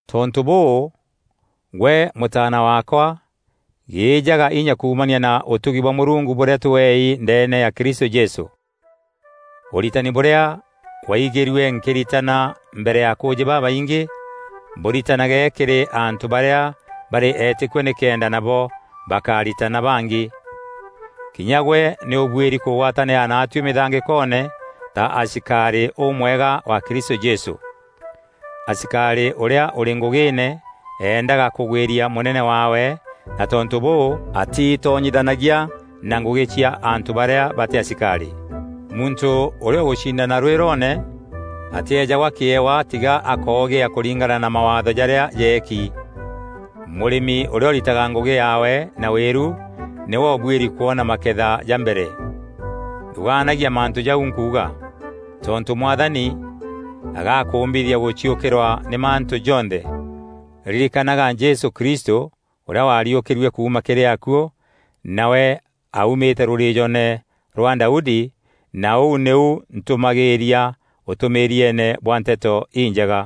Tontû bûû, gwe mûtaana waakwa, gîîjaga inya kuumania na ûtugi bwa Mûrungu bûrîa tweei ndeene ya Kristû Jesû. Ûritani bûrîa waaigîrue nkîritana mbere ya akûûjî babaingî, bûritanage kîrî antû barîa barî eetîkua nîkenda nabo bakaritana bangî. Kinya gwe nî ûbuîri kûgwatanîra naatuî mîthangîkoone ta asikarî ûmwega wa Kristû Jesû. Asikarî ûrîa ûrî ngûgîîne eendaga kûgwîria mûnene waawe na tontû bûu atiitonyithanagia na ngûgî cia antû barîa batî asikarî. Muntû ûrîa ûgûcindana rwîroone atîeejagwa kîewa tiga akoogîa kûringana na mawaatho jarîa jeeki. Mûrîmi ûrîa ûritaga ngûgî yaawe na wîru nîwe ûbuîri kwona maketha ja mbere. Thûgaanagia mantû jau nkuuga, tontû Mwathani agakûûmbithia gûciûkîrwa nî mantû jonthe. Ririkanaga Jesû Kristû, ûrîa wariûkîrue kuuma kîrî akuû, nawe aaumîte rûrîîjoone rwa Daudi, na ûu nîu ntûmagîîria ûtûmîîrieene bwa Nteto Injega.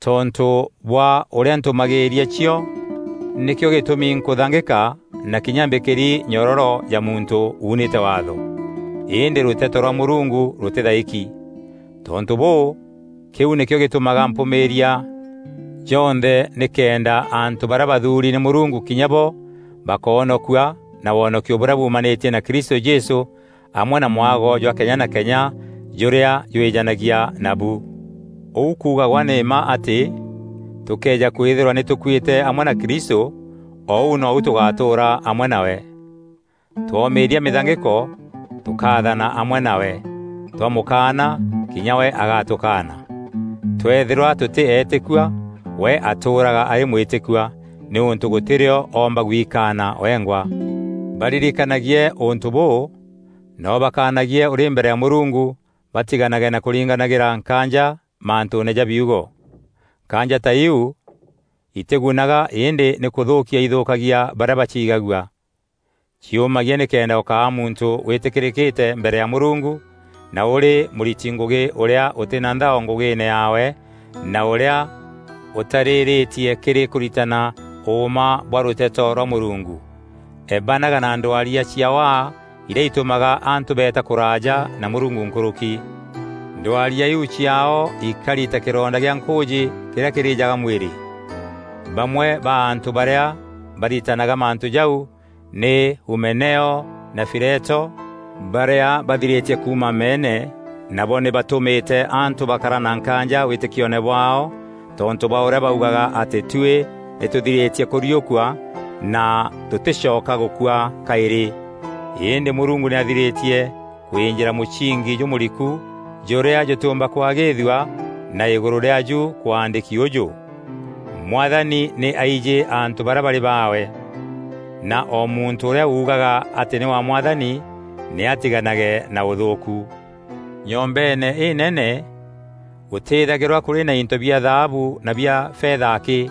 Tontû bwa ûrîa ntûmagîîria cio, nîkîo gîtûmi nkûthangîka na kinya mbîkîri nyororo ja muntû uunîte Waatho. Îndî rûteto rwa Mûrungu rûtîthaîki. Tontû bûû, kîu nîkîo gîtûmaga mpûmîîria jonthe nîkenda antû barîa bathuuri nî Mûrungu kinya bo bakoonokua na wonokio bûrîa buumanîtie na Kristû Jesû amwe na mwago jwa kenya na kenya jûrîa jwîjanagia nabu. Ûu kuugagwa nî mma atî: Tûkëeja kwîthîrwa nî tûkuîte amwe na Kristû, o ûu nou tûgatûûra amwe nawe. Twoomîîria mîthangîko, tûkaathana amwe nawe; twamûkaana, kinya we agatûkaana. Twëethîrwa tûtî eetîkua, we atûûraga arî mwîtîkua, nîûntû gûtî rîo oomba gwikaana wengwa. Baririkanagie ûntû bûû na ûbakaanagie ûrî mbere ya Mûrungu batiganage na kûringanagîra nkaanja mantûûne ja biugo. Nkaanja ta iu itîgunaga îndî nî kûthûûkia ithûûkagia barîa baciigagua. Ciûmagie nîkenda ûkaa muntû wîtîkîrîkîte mbere ya Mûrungu na ûrî mûriti ngûgî ûrîa ûtî na nthao ngûgîîne yaawe na ûrîa ûtarîrîîtie kîrî kûritana ûûma bwa rûteto rwa Mûrungu. Ebanaga na ndwaria cia waa irîa itûmaga antû beeta kûraaja na Mûrungu nkûrûki. Ndwaria iu ciaao ikari ta kîronda gîa nkûûjî kîrîa kîrîjaga mwîrî. Bamwe ba antû barîa baritanaga mantû jau nî Humeneo na Fileto, barîa bathirîtie kuuma meene nabo nî batumîte antû bakara na nkaanja wîtîkioone bwaao tontû bwa ûrîa baugaga atî tuî nî tûthirîtie kûriûkua na tûtîcoka gûkua kaîrî. Îndî Mûrungu nî athirîtie kwînjîra mûsingi jûmûriku jûrîa jûtîûmba kwagîîthua na îgûrû rîaaju kwaandîki ûjû, “Mwathani nî aijî antû barîa barî baawe,” na “O muntû ûrîa ugaga atî nî wa Mwathani, nî atiganage na ûthûûku.” Nyombeene înene, gûtîthagîrwa kûrî na into bia thaabu na bia fetha akî.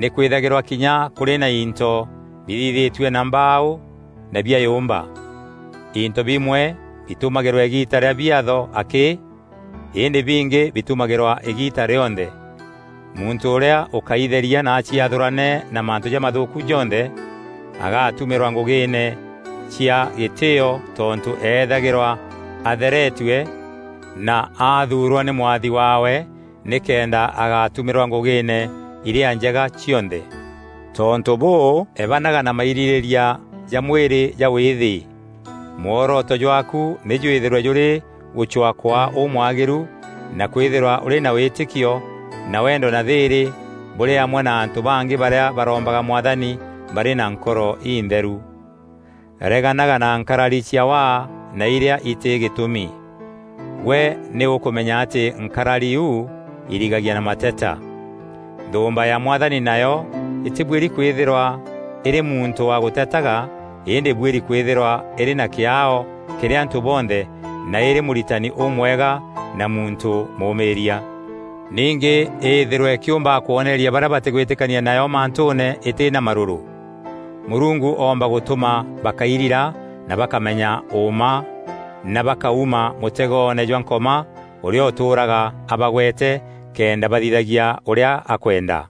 Nîkwîthagîrwa kinya kûrî na into bithithîtue na mbaaû na bia yûmba. Into bimwe bitumagîrwa îgiita rîa biatho akî îndî bingi bitumagîrwa îgiita rîonthe. Muntû ûrîa ûkaitheria na aciathûrane na mantû jamathûûku jonthe, agatumîrwa ngûgîîne cia gîtîîo tontû eethagîrwa atheretue na athuurwa nî mwathi waawe nîkenda agatumîrwa ngûgîîne irîa njega cionthe. Tontû bûû, ebanaga na mairîrîîria ja mwîrî ja wîîthî. Mworoto jwaaku nî jwîthîrwe jûrî gûcwaa kwaa ûmwagîru na kwîthîrwa ûrî na wîtîkio na wendo na thîîrî bûrî amwe na antû bangî barîa barombaga Mwathani barî na nkoro intheru. Reganaga na nkarari cia waa na irîa itî gîtûmi. Gwe nî ûkûmenya atî nkarari iu irigagia na mateta. Nthûûmba ya Mwathani nayo îtîbuîri kwîthîrwa îrî muntû wa gûtetaga îndî îbuîri kwîthîrwa îrî na kîaao kîrî antû bonthe na îrî mûritani ûmwega na muntû mûmîîria. Ningî îthîrwe îkîûmbaga kwoneeria barîa batîgwîtîkania nayo mantûûne îtî na marûrû. Mûrungu oomba gûtûma bakairira na bakamenya ûûma na bakauma mûtegoone jwa Nkoma ûrîa ûtûûraga abagwete kenda bathithagia ûrîa akwenda.